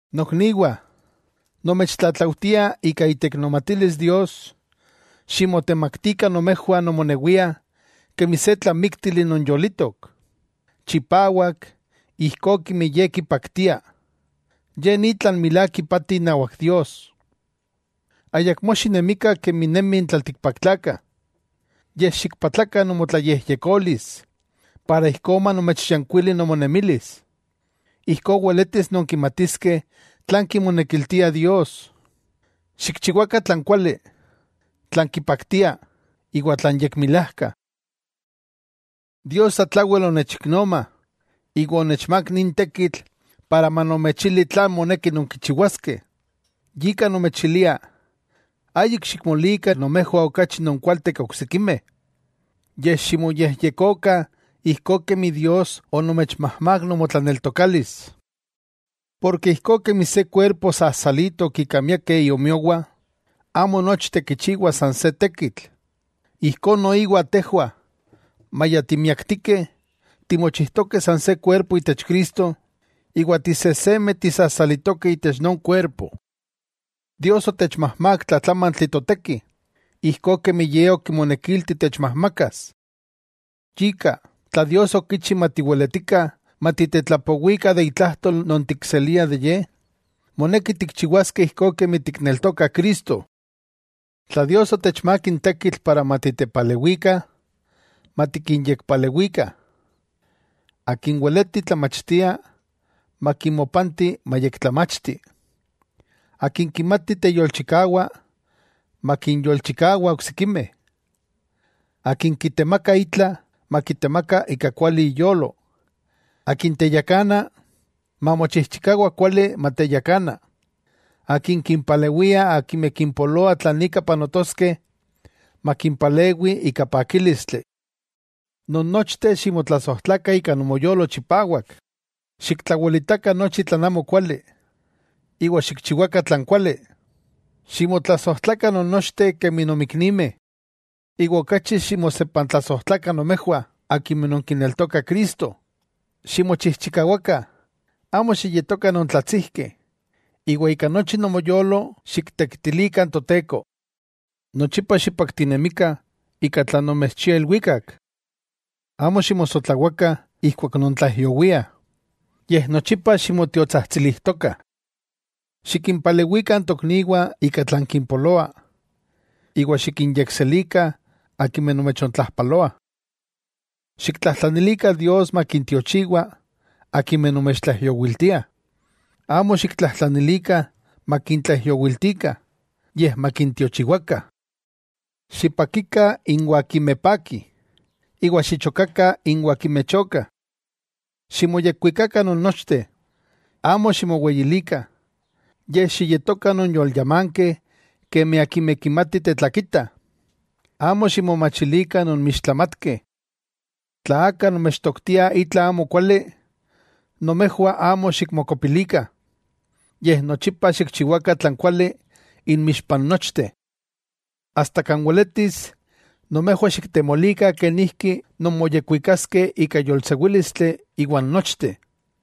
Nokniwah, nomechtlatlaujtia ika iteiknomatilis Dios, ximotemaktikah nomejwah nomonewiah kemi se tlamíktili non yolitok, chipawak ijkó kemi Ye kipaktia. Ye ni tlan milák ipati inawak Dios. Ayakmó xinemikah kemi nemih n tlaltikpaktlakah, yej xikpatlakah nomotlayejyekolis para ijkó manomechyankuili nomonemilis. Ijkó weletis nonkimatiskeh tlan kimonekiltia Dios, xikchiwakah tlan kuali, tlan kipaktia, iwa tlan yekmilajka. Dios satlawel onechiknoma iwa onechmák nin tekitl para manomechili tlan moneki nonkichiwaskeh, yika nomechilia ayik xikmolikah nomejwah okachi nonkualteh ke oksikimeh, yej ximoyejyekokah ijkó kemi Dios onomechmajmák nomotlaneltokalis. Porke ijkó kemi se kuerpo sasalitok ika miakeh iomiowah, amo nochteh kichiwah san se tekitl. Ijkó noiwa tejwah, maya timiaktikeh, timochijtokeh san se kuerpo itech Cristo, iwa tisejsemeh tisasalitokeh itech non kuerpo. Dios otechmajmák tlatlamantli toteki, ijkó kemi Ye okimonekilti techmajmakas. Yika, tla Dios okichi matiweletikah, matiktetlapowikah itlajtol non tikseliah de Ye, moneki tikchiwaskeh ijkó kemi tikneltokah Cristo. Tla Dios otechmák n tekitl para matitepalewikah, matikinyekpalewikah. Akin weleti tlamachtia, makimopanti mayektlamachti. Akin kimati teyolchikawa, makinyolchikawa oksikimeh. Akin kitemaka itla, makitemaka ika kuali iyolo. Akin teyakana, mamochijchikawa kuali mateyakana; akin kimpalewia akimeh kimpoloa tlan ika panotoskeh, makimpalewi ika pakílistli. Nonnochteh ximotlasojtlakah ika nomoyolo chipawak. Xiktlawelitakah nochi tlan amokuali, iwa xikchiwakah tlan kuali. Ximotlasojtlakah non nochteh kemi nonmiknimeh, iwa okachi ximosepantlasojtlakah nomejwah akimeh non kineltokah Cristo. Ximochijchikawakah, amo xiyetokah nontlatsijkeh, iwa ika nochi nomoyolo xiktekitilikah n Toteko. Nochipa xipaktinemikah ika tlan nomechchia ilwikak. Amo ximosotlawakah ijkuak nontlaijyowiah, yej nochipa ximotiotsajtsilijtokah. Xikimpalewikah n tokniwah ika tlan kimpoloa, iwa xikinyekselikah akimeh nomechontlajpaloah. Xiktlajtlanilikah Dios makintiochiwa akimeh nomechtlaijyowiltiah, amo xiktlajtlanilikah makintlaijyowiltikah, yej makintiochiwakah. Xipakikah inwah akimeh pakih, iwa xichokakah inwah akimeh chokah. Ximoyekwikakah non nochteh. Amo ximoweyilikah, yej xiyetokah nonyolyamankeh kemi akimeh kimatih tetlakitah. Amo ximomachilikah nonmixtlamatkeh. Tla aka nomechtoktia itla amokuali, nomejwah amo xikmokopilikah, yej nochipa xikchiwakah tlan kuali inmixpa n nochteh. Asta kan weletis, nomejwah xiktemolikah kenijki nonmoyekwikaskeh ika yolsewílistli iwan nochteh.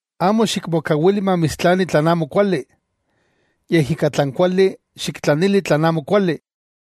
Amo xikmokawili mamitstlani tlan amokuali, yej ika tlan kuali xiktlanili tlan amokuali.